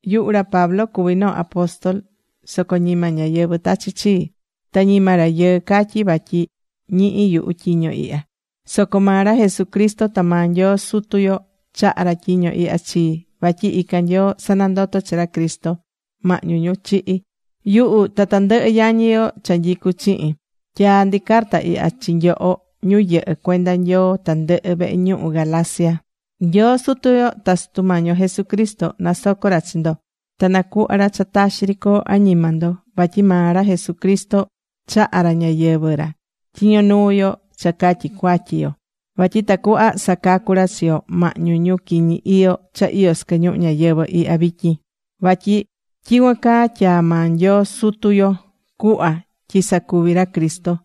Yuhu ra Pablo cuví noo apóstol. Soco ñima ñáyɨvɨ tachi̱ chii. Ta ñima rayɨɨ catyi̱ vatyi ñihi̱ yuhu tyiño ihya. Soco maa ra Jesucristo ta maa Nyoo Sutu yo chaha̱ ra tyiño ihya chii. Vatyi ican Nyoo sanandoto̱ chi ra Cristo mahñu ñu chihi̱. Yuhu ta tandɨhɨ yañi yo cha nyicú chihin, tyaá ndi carta ihya chi nyoho ñu yɨhɨ́ cuenda Nyoo tandɨhɨ vehe ñuhu Galacia. Nyoo Sutu yo ta Sutu Mañi yo Jesucristo nasoco ra chi ndo ta nacuhva ra cha taxi ri coo añima ndo. Vatyi maa ra Jesucristo chaha̱ ra ñayɨvɨ̱ ra tyiño nuu yo cha catyi cuatyi yo. Vatyi tacuhva sacacú ra chi yo mahñu ñu quiñi iyo cha iyó sɨquɨ ñuhu ñayɨvɨ̱ ihya vityin. Vatyi tyicuan caa tyaa̱ maa Nyoo Sutu yo cuhva tyi sacuvi ra Cristo.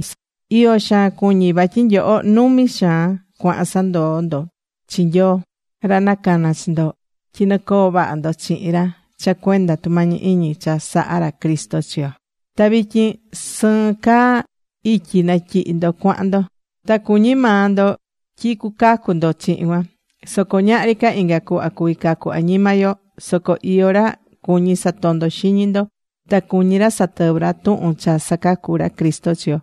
Iyo xaan cuñí vatyi nyoho numi xaan cuahan sandoó ndo chi Nyoo, ra nacana̱ chi ndo tyi nɨcoo vaha ndo chihin ra cha cuenda tumañi iñi cha sahá ra Cristo chi yo. Ta vityin sɨɨn caa ityi natyihi ndo cuahan ndo. Ta cuñi maa ndo tyi cucacu ndo chihin cuan. Soco ñahri ca inga cuhva cuví cacu añima yo. Soco iyó ra cuñí satondo xiñi ndo. Ta cuñí ra satɨvɨ ra tuhun cha sacacu ra Cristo chi yo.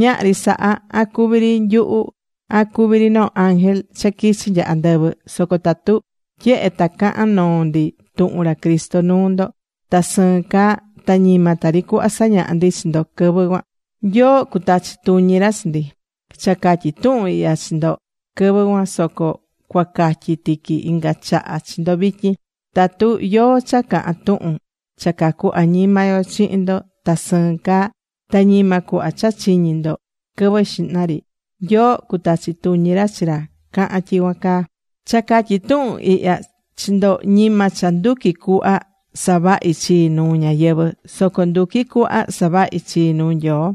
Ñahri saha, an cuví ri nyuhu, an cuví ri noo ángel cha quichi nya andɨvɨ, soco tatu tyehe ta cahán noo ndi tuhun ra Cristo nuu ndo, ta sɨɨn caa, ta ñima tari cuhva sañaha̱ ndi chi ndo quɨvɨ cuan, Nyoo cutachi tuñi ra chi ndi. Cha catyi̱ tuhun ihya chi ndo quɨvɨ cuan soco cuacatyi tiqui inga chaha chi ndo vityin. Tatu yóó cha cahán tuhun cha cacú añima yo chihin ndo ta sɨɨn caa, ta ñima cuhva cha chiñi̱ ndo quɨvɨ xihna ri, Nyoo cutachi tuñi ra chi ra cahán tyicuan caa. Cha catyí tuhun ihya chi ndo, ñima cha nduquí cuhva savahi chii nuu ñáyɨvɨ. Soco nduquí cuhva savahi chii nuu Nyoo.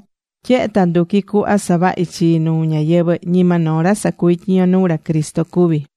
Tyehe ta nduquí cuhva saváhi chii nuu ñáyɨvɨ, ñima noo ra sacuví tyiño nuu ra Cristo cuví.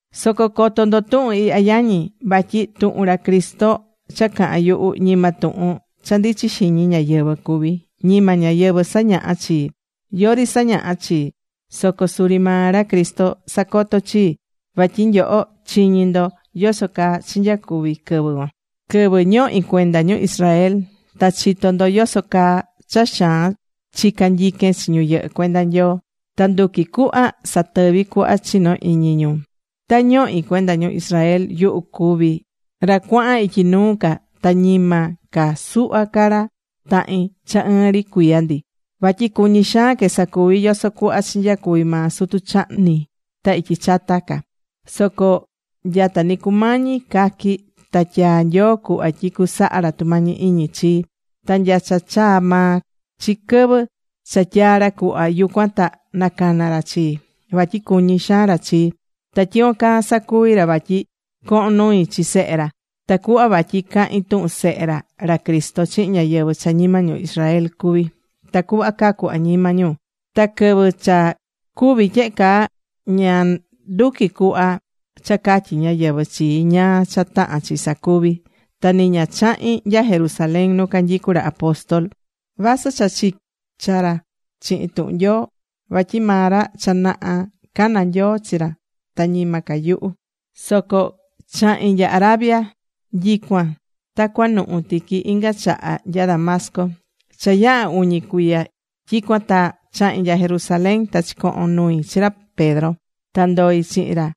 Soco co̱to ndo tuhun ihya yañi, vatyi tuhun ra Cristo cha cahán yuhu, ñima tuhun cha ndichí xiñi ñáyɨvɨ cuví. Ñima ñáyɨvɨ sañaha̱ chii. Yori sañaha̱ chii. Soco suri maa ra Cristo sacotó chii. Vatyi nyoho chiñi̱ ndo yoso caa chinyacuvi quɨvɨ cuan, quɨvɨ ñohi̱ cuenda ñu Israel. Ta chitó ndo yoso caa cha xaan chica̱ nyiquen chi ñu yɨhɨ́ cuenda Nyoo. Ta nduqui̱ cuhva satɨvi cuhva chinó iñi ñu. Ta ñohi̱ cuenda ñu Israel, yuhu cuvi̱ ra cuahan ityi nuu ca ta ñima ca suhva ca ra tahin cha ɨɨn ri cuiya ndi. Vatyi cuñi̱ xaan que sacuvi yoso cuhva chinyacuvi maa sutu chahni ta ityi chata ca. Soco nya ta ni cumañi caqui ta tyaa̱ Nyoo cuhva tyi cusaha ra tumañi iñi chii. Ta nya cha chaa maa chi quɨvɨ cha tyaa̱ ra cuhva, yucuan ta nacana̱ ra chii. Vatyi cuñí xaan ra chii. Ta tyicuan caa sacuvi̱ ra vatyi cohon nui chi Sehe ra. Tacuhva vatyi cahin tuhun Sehe ra, ra Cristo, chihin ñáyɨvɨ cha ñima ñu Israel cuví, tacuhva cacu añima ñu. Ta quɨvɨ cha cuvi̱ tyehe caa, ña nduqui̱ cuhva cha catyí ñáyɨvɨ chii ñáá cha tahán chi sacuvi. Ta ni ña chahi̱n nya Jerusalén nu canyicu ra apóstol, vasɨ cha chicha ca ra chihin tuhun Nyoo, vatyi maa ra cha naha cana̱ Nyoo chi ra ta ñima ca yuhu. Soco chahi̱n nya Arabia. Tyicuan ta cuanuhu tiqui inga chaha nya Damasco. Cha yaha̱ uñi cuiya tyicuan ta chahi̱n nya Jerusalén, ta chicohon nui chi ra Pedro. Ta ndoi̱ chihin ra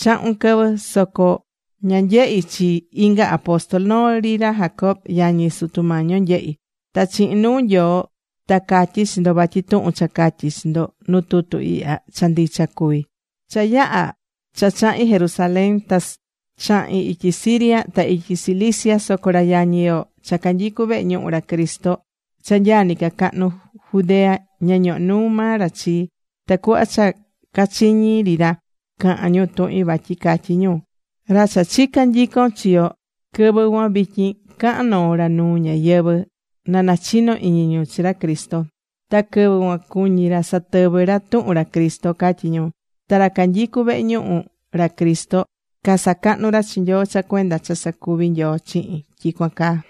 chahun quɨvɨ. Soco ña nyehi̱ chi inga apóstol. Noo ri ra Jacobo yañi Sutu Mañi yo nyehi̱. Ta chihin nuu Nyoo ta catyí chi ndo vatyi tuhun cha catyí chi ndo nu tutu ihya, cha ndicha cuví. Cha yaha̱ cha chahi̱n Jerusalén ta chahi̱n ityi Siria ta ityi Cilicia. Soco ra yañi yo cha canyicu vehe ñuhu ra Cristo cha nyaa nɨcacahnu Judea, ña ñoho̱ nuu maa ra chii. Tacuhva cha cachiñi̱ ri ra caha̱n ñu tuhin, vatyi catyi̱ ñu: “Ra cha chica̱ nyicon chi yo quɨvɨ cuan, vityin cahán noo ra nuu ñáyɨvɨ na nachino iñi ñu chi ra Cristo. Ta quɨvɨ cuan cuñi̱ ra satɨvɨ ra tuhun ra Cristo”, catyi̱ ñu. Ta ra canyicu vehe ñuhu ra Cristo casacahnu̱ ra chi Nyoo cha cuenda cha sacuvi̱ Nyoo chihin tyicuan caa.